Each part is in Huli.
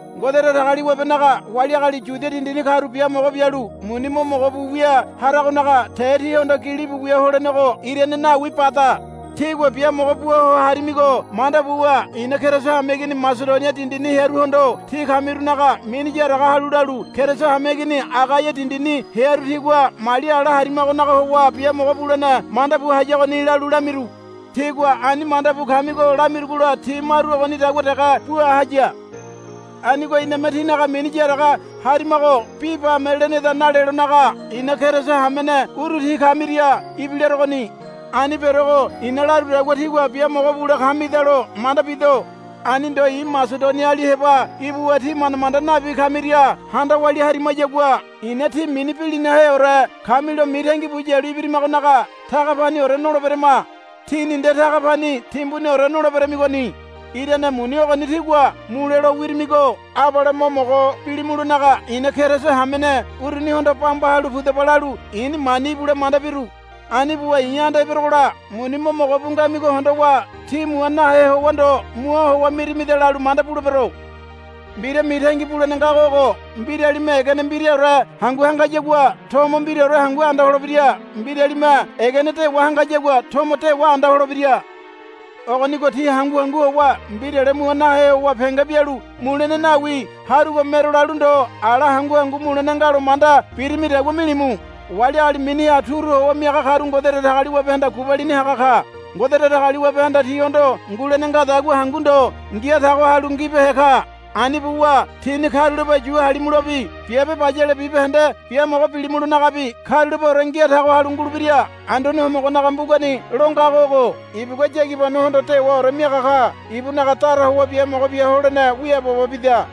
Ngode Datagaliwabenaga wali agali Yudia dindini karu biamogo bialu muni mo mogo bu wia haragonaga te tíhondo gilibu wia holenego irane nawi bada. Tígua biamogo bua ho harimigo manda buwa i̱na Keriso hameigini Masedonia dindini hearuhondo tí kamirunaga mini yaraga halu lalu, Keriso hameigini Agaia dindini hearu tigua mali ala harimagonaga howa biamogo bulene manda bu hayagoni, lalu lamiru. Tígua ani manda bu kamigo lamirugola ti maru ogonidagua dege bua haya. Anigo iname tínaga mini yaraga harimago bi bame leneda nalelonaga i̱na Keriso hamene uru tí kamiria ibilarogoni. Ani berogo i̱na larudagua tígua biamogo bule kamidalo manda bido. Ani ndo i̱ Masedoniali heba ibuwa tí manda manda nabi kamiria handa walia harimayagua ina tí mini bilinaheore kamilo mitangi bu yalu ibirimagonaga taga paniore noleberama. Tíni nde taga pani timbuniore noleberamigoni. Irane muni ogoni tígua mule lo wirimigo abale mo mogo bilimulonaga i̱na Keriso hamene urunihondo, Bamba halu pudaba, lalu i̱ni mani ibule manda biru. Ani buwa i̱ anda eberogola muni mo mogo bu ngamigo hondowa. Tí mua nahe howa ndo mua howa mirimida, lalu manda bulebero. Mbira mitangi bulene ngago ogo. Mbiralime egene mbiraore hangu hangayagua tomo mbiraore hangu anda holebira. Mbiralime egene dewa hangayagua tomo dewa anda holebira. Ogonigo tí hangu hangu howa mbirale mua nahe howa penge bialu, Mulene nawi harugo mero, lalu ndo ala hangu hangu mulene nga lo manda birimidagua milimu. Wali agali miniha turu howa miaga karu Ngode Datagaliwabehanda gubalini haga ka. Ngode Datagaliwabehanda tíhondo ngulene ngadagua hangu ndo ngia tago halu ngibehe ka. Ani buwa tíni karulape yu halimulobi biabe bayale bibahende biamogo bilimulonagabi karulapeore ngia tago halu ngulebira. Anduane Homogonaga mbugani lo ngago ogo, Ibugua yagibanohondo dewaore miaga ka. Ibunaga dara howa biamogo bia holene wiaabobo bida,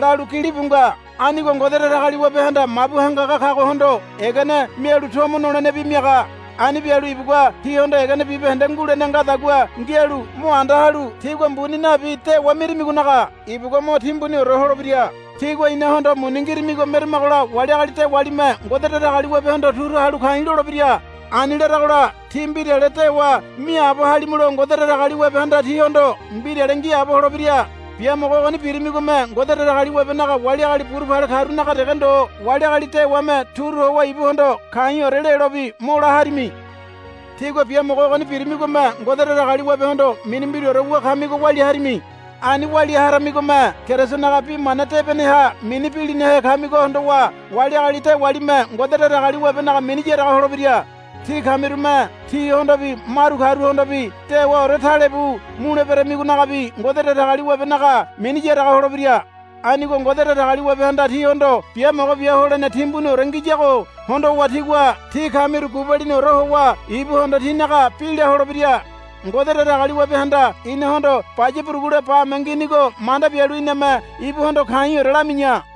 lalu gilibu nga. Anigo Ngode Datagaliwabehanda mabu hangaga kagohondo egene mialu tomo nolenebi miaga. Ani bialu ibugua tíhondo egene bibahende ngulene ngadagua ngialu mo anda halu tígua mbuni nabi dewa mirimigonaga ibugua mo timbuniore holebira. Tígua inahondo muni ngirimigo meramagola wali agali dewalime Ngode Datagaliwabehondo turu halu ka̱i̱ lolebira. Ani laragola tí mbirale dewa miaabo halimulo Ngode Datagaliwabehanda tíhondo mbirale ngiaabo holebira. Biamogo ogoni birimigome Ngode Datagaliwabenaga wali agali burupale karunaga dege ndo wali agali dewame turu howa ibuhondo ka̱i̱ore lelobi mo la harimi. Tígua biamogo ogoni birimigome Ngode Datagaliwabehondo mini mbiraore wu kamigo walia harami. Ani walia haramigome Kerisonaga bi mana debeneha mini bilinahe kamigo hondowa wali agali dewalime Ngode Datagaliwabenaga mini yaraga holebira. Tí kamirume tihondobi maru karuhondobi dewaore talebu muleberamigonagabi Ngode Datagaliwabenaga mini yaraga holebira. Anigo Ngode Datagaliwabehanda tíhondo biamogo bia holene timbuniore ngiyago hondowa tigua tí kamiru gubaliniore howa ibuhondo tínaga bi la holebira. Ngode Datagaliwabehanda inahondo baya burugule bame nginigo manda bialu iname ibuhondo ka̱i̱ore lami̱ya.